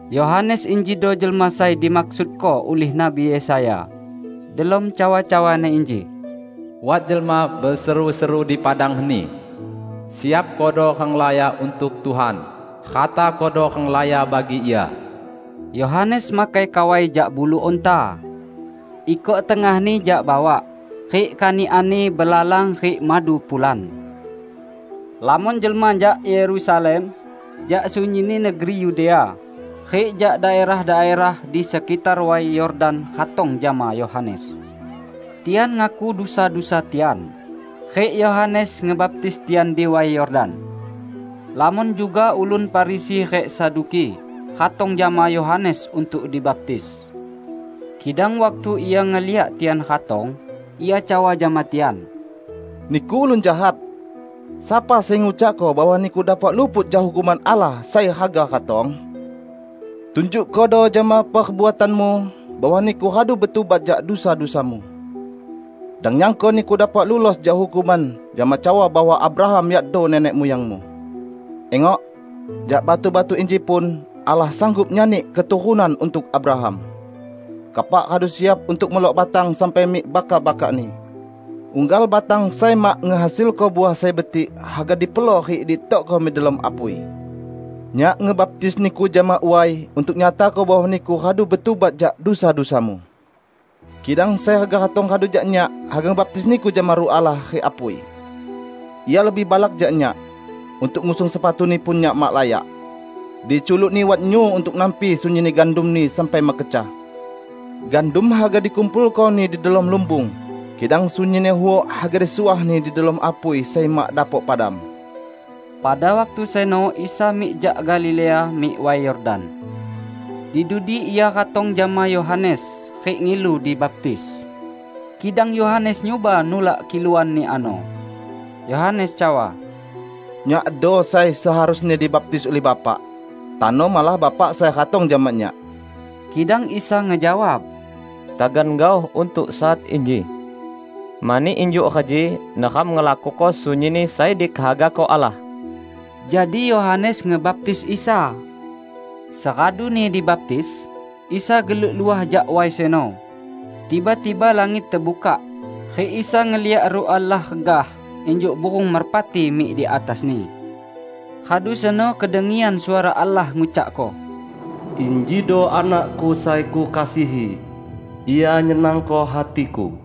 Yohanes injido jelma sai dimaksudko ulih Nabi Yesaya delom cawa-cawani inji, "Wat jelma beseru-seru di padang heni, 'Siapkodo renglaya untuk Tuhan; ratakodo renglaya bagi Ia.' " Yohanes makai kawai jak bulu unta. Ikok tengahni jak bawak, rik kanikanni belalang rik madu pulan. Lamon jelma jak Yerusalem, jak sunyinni negeri Yudea rik jak daerah-daerah di sekitar Way Yordan ratong jama Yohanes. Tian ngaku dusa-dusa tian, rik Yohanes ngebaptis tian di Way Yordan. Lamon juga ulun Farisi rik Saduki ratong jama Yohanes untuk dibaptis. Kidang waktu ia ngeliak tian ratong, ia cawa jama tian, "Niku ulun jahat! Sapa sai ngucakko bahwa niku dapok luput jak hukuman Allah sai haga ratong? Tunjukkodo jama perbuatanmu bahwa niku radu betubat jak dusa-dusamu. Dang nyangko niku dapok lulos jak hukuman jama cawa bahwa Abraham yakdo nenek muyangmu. Ingok, jak batu-batu inji pun, Allah sanggup nyani keturunan untuk Abraham! Kapak radu siap untuk melok batang sampai mik bakak-bakakni. Unggal batang sai mak ngehasilko uah sai betik haga dipelok rik ditokko mik delom apui. Nyak ngebaptis niku jama way untuk nyatako bahwa niku radu betubat jak dusa-dusamu; kidang sai haga ratong radu jak nyak, haga ngebaptis niku jama Ruh Allah rik apui. Ia lebih balak jak nyak. Untuk ngusung sepatu-Ni pun nyak mak layak. Di culuk-Ni wat nyu untuk nampi sunyinni gandum-Ni sampai mekecah. Gandum haga dikumpulko-Ni di delom lumbung, kidang sunyinni huok haga disuah-Ni di delom apui sai mak dapok padam." Pada waktu seno Isa mik jak Galilea mik Way Yordan. Di dudi Ia ratong jama Yohanes rik ngilu dibaptis. Kidang Yohanes nyuba nulak kiluan-Ni ano. Yohanes cawa, "Nyakdo sai seharusni dibaptis ulih Bapak. Tano malah Bapak sai ratong jama nyak." Kidang Isa ngejawab, "Tagan gaoh untuk saat inji. Mani injuk reji neram ngelakuko sunyinni sai dikehagako Allah." Jadi Yohanes ngebaptis Isa. Seraduni dibaptis, Isa geluk luah jak way seno. Tiba-tiba langit tebukak rik Isa ngeliak Ruh Allah regah injuk burung merpati mik di atas-Ni. Radu seno kedengian suara Allah ngucakko, "Injido Anak-Ku sai Kukasihi. Ia nyenangko hati-Ku."